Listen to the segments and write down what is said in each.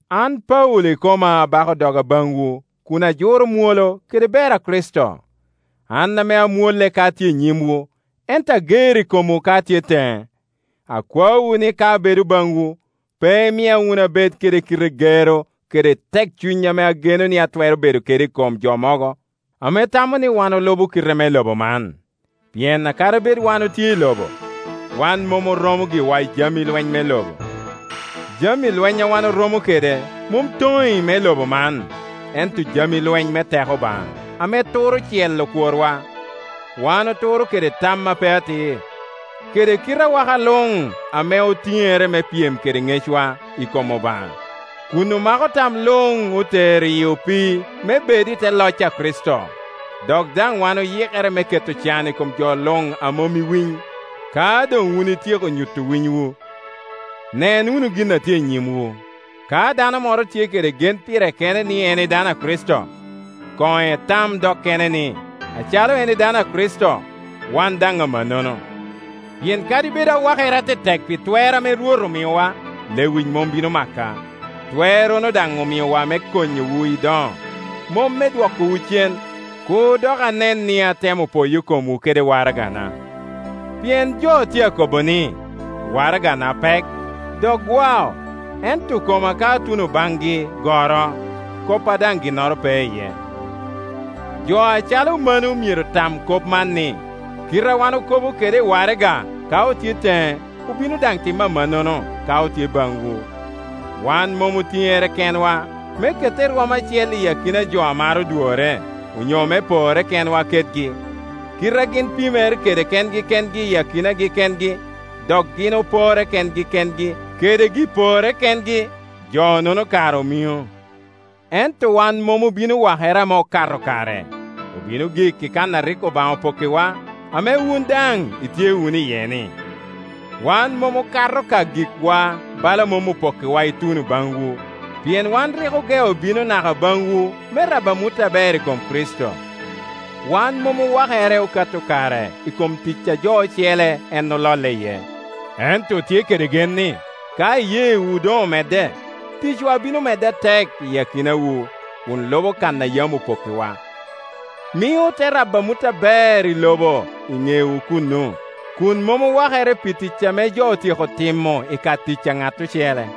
An Paulo ikoma abako doga baŋwu kun ajuro mwolo kede ber a Kricito, an ame amwolle ka atye i nyimwu, ento ager i komwu ka atye teŋe. Akwaowu ni ka abedo baŋwu, pe imia wunu abed kede kite gero kede tekcuny ame ageno ni atwero bedo kede i kom jo mogo ame tamo ni wan olubo kite me lobo man. Pien kadi bed wan otye i lobo, wan mom oromo giwa i jami Iweny me lobo. Jami lwenya wan oromo kede mom toŋi me lobo man, ento jami lweny me teko Obaŋa, ame turo cel okworwa. Wan oturo kede tam a pe atir, kede kite awaka luŋ ame otiŋere me pyem kede ŋecwa i kom Obaŋa; kun omako tam luŋ otero iyi opii, me bed i te loc a Kricito. Dok daŋ wan oyikere me keto can i kom jo luŋ a mom i winy, ka doŋ wun ityeko nyuto winywu. Nen wunu gin a tye i nyimwu. Ka dano moro tye kede gen pire kene ni en edano a Kricito, koŋ etam dok kene ni, acalo en edano a Kricito, wan daŋ amannono. Pien kadi bed awakere atetek pi twer ame Rwot amiowa, lewic mom bino maka; twerrono daŋ omiowa me konyowu i doŋo, mom me dwokowu cen. Kur dok anen ni atemo poyo komwu kede waragana. Pien jo tye akobo ni, “waraga na pek, dok gwa, ento koma ka atuno baŋgi goro, koppa daŋ ginnoro pe iye.” Jo acalo mano myero tam kop man ni, kite a wan okobo kede i waraga ka otye teŋe obino daŋ timo amannono ka otye baŋwu. Wan mom otiŋere kenwa me kette i rwom acel i jo mogo i akina jo a maro dworre, onyo me porre kenwa kedgi. Kite a gin pimere kede kengi kengi i akinagi kengi, dok gin oporre kengi kengi kede gi-porregi kengi, jo-nono kara omiŋo. Ento wan mom obino wakere ame okato kare; obino gik i kan a rik Obaŋa opokkiwa, ame wun daŋ itye wunu iye-ni. Wan mom okato ka gikwa bala mom opokkiwa ituno baŋwu, pien waa rik ogeo bino naka baŋwu me rabo amut aber i kom Kricito. Wan mom owakere okato kare i kom tic a jo ocele en ololle iye; ento otye kede gen ni ka iyeewu doŋ omedde, ticwa bino medde atek i akinawu, kun lubo kan a yam opokk iwa. Mio ote rabo amut aber i lobo i ŋewu kuno, kun mom owakere pi tic ame jo otyeko timo i ka tic a ŋat ocele.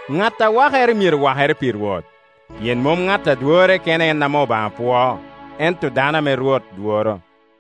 “Ŋat a wakere myero wakere pi Rwot.” Pien mom ŋat a dworre kene en ame Obaŋa pwoo, ento dano ame Rwot dworo.